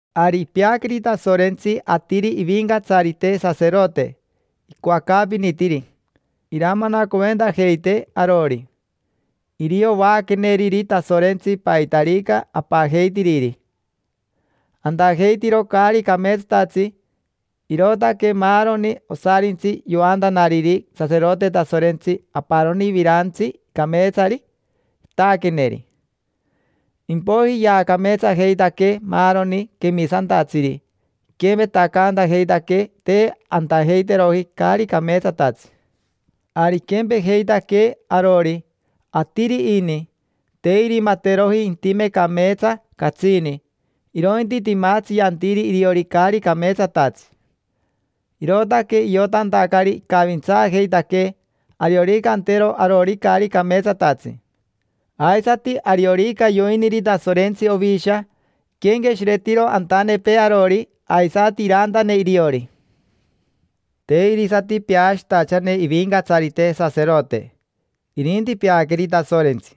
Ari ipeaqueri Tasorentsi atiri ivincatsarite saserote, icoacaapinitiri iramanacoventajeitee arori. Irio vaaqueneriri Tasorentsi paitarica apajeitiriri. Antajeitiro caari cameetsatatsi, irootaque maaroni osarintsi yoantanariri saserote Tasorentsi aparoni virantsi cameetsari, itaaqueneri. Impoiji yaacameetsajeitaquee maaroni quemisantatsiri, iquempetacantajeitaquee te antajeiteroji caari cameetsatatsi. Ari iquempejeitaquee arori, atiri ini; te irimateroji intime cameetsa catsini, irointi timatsi yantiri iriori caari cameetsatatsi. Irootaque iotantacari icavintsaajeitaquee ariorica antero arori caari cameetsatatsi. Aisati ariorica yoiniri Tasorentsi ovisha, iquenqueshiretiro antanepee arori, aisati irantane iriori. Te irisati peashitachane ivincatsarite saserote, irinti peaqueri Tasorentsi;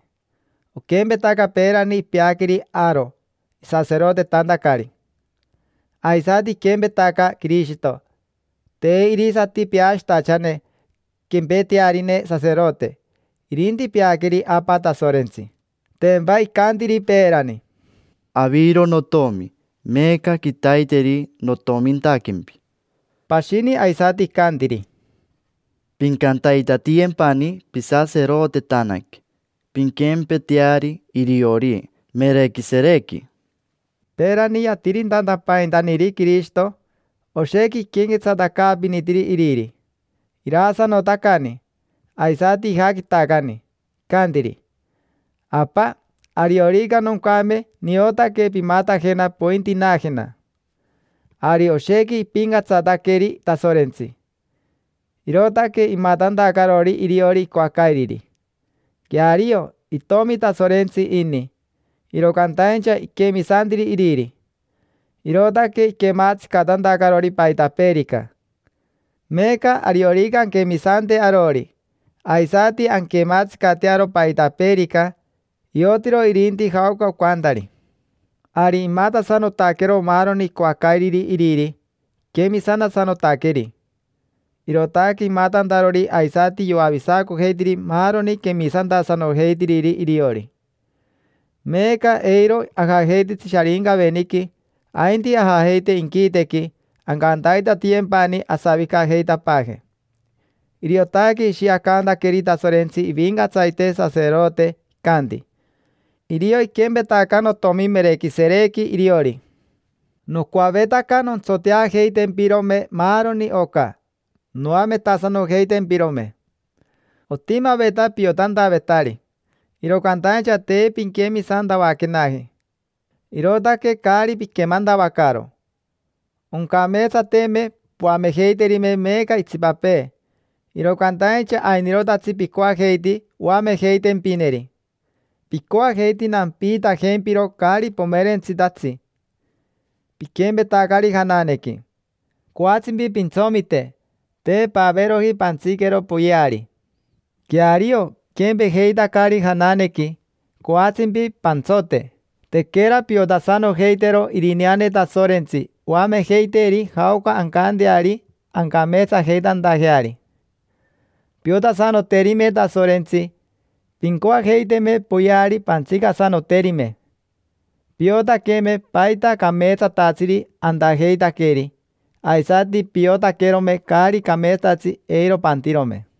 oquempetaca peerani ipeaqueri Aaro isaserotetantacari. Aisati iquempetaca Quirishito: te irisati peashitachane quempetearine saserote, irinti peaqueri Apa Tasorentsi. Tempa icantiri peerani: “Aviro notomi, meeca quitaiteri notomintaquempi”. Pashini aisati icantiri: “Pincantaitatiyempani pisaserotetanaque, pinquempeteari iriori Merequiserequi”. Peerani, yatiritantapaintaniri Quirishito, oshequi iquenquetsatacaapinitiri Iriri, iraasanotacani, aisati ijaquitacani; icantiri: “Apa, ariorica noncame niotaque pimatajena pointinaajena”. Ari oshequi ipincatsataqueri Tasorentsi, irootaque imatantacarori iriori icoacairiri. Queario, itomi Tasorentsi ini, iro cantaincha iquemisantiri Iriri, irootaque iquematsicatantacarori paitapeerica. Meeca ariorica anquemisante arori, aisati anquematsicatearo paitapeerica, iotiro irinti jaoca ocantari. Ari imatasanotaquero maaroni icoacairiri iriri, iquemisantasanotaqueri: irootaque imatantarori aisati yoavisacojeitiri maaroni quemisantasanojeitiriri iriori. Meeca eiro ajajeititsi Sharincaveniqui, ainti ajajeite inquitequi, ancantaitatiyempani asavicajeitapaaje. Iriotaque ishiacantaqueri Tasorentsi ivincatsarite saserote, icanti: “Irio iquempetaca notomi Merequiserequi iriori”. Nocoavetaca nontsoteajeitempirome maaroni oca, noametasanojeitempirome. Otimaveta piotantavetari, iro cantaincha te pinquemisantavaquenaji, irootaque caari piquemantavacaro. Oncameetsateme poamejeiterime meeca itsipapee, iro cantaincha ainirotatsi picoajeiti oamejeitempineri. Picoajeiti nampiitajempiro caari pomerentsitatsi. Piquempetacari jananequi: coatsimpi pantsomite, te paveeroji pantsiquero poyeari. Queario, piquempejeitacari jananequi, coatsimpi pantsote: tequera piotasanojeitero Irineane Tasorentsi oamejeiteeri jaoca ancanteari ancameetsajeitantajeari. Piotasanoterime Tasorentsi, pincoajeiteme poyeari pantsicasanoterime. Piotaqueme paita cameetsatatsiri antajeitaqueri, aisati piotaquerome caari cameetsatatsi eiro pantirome.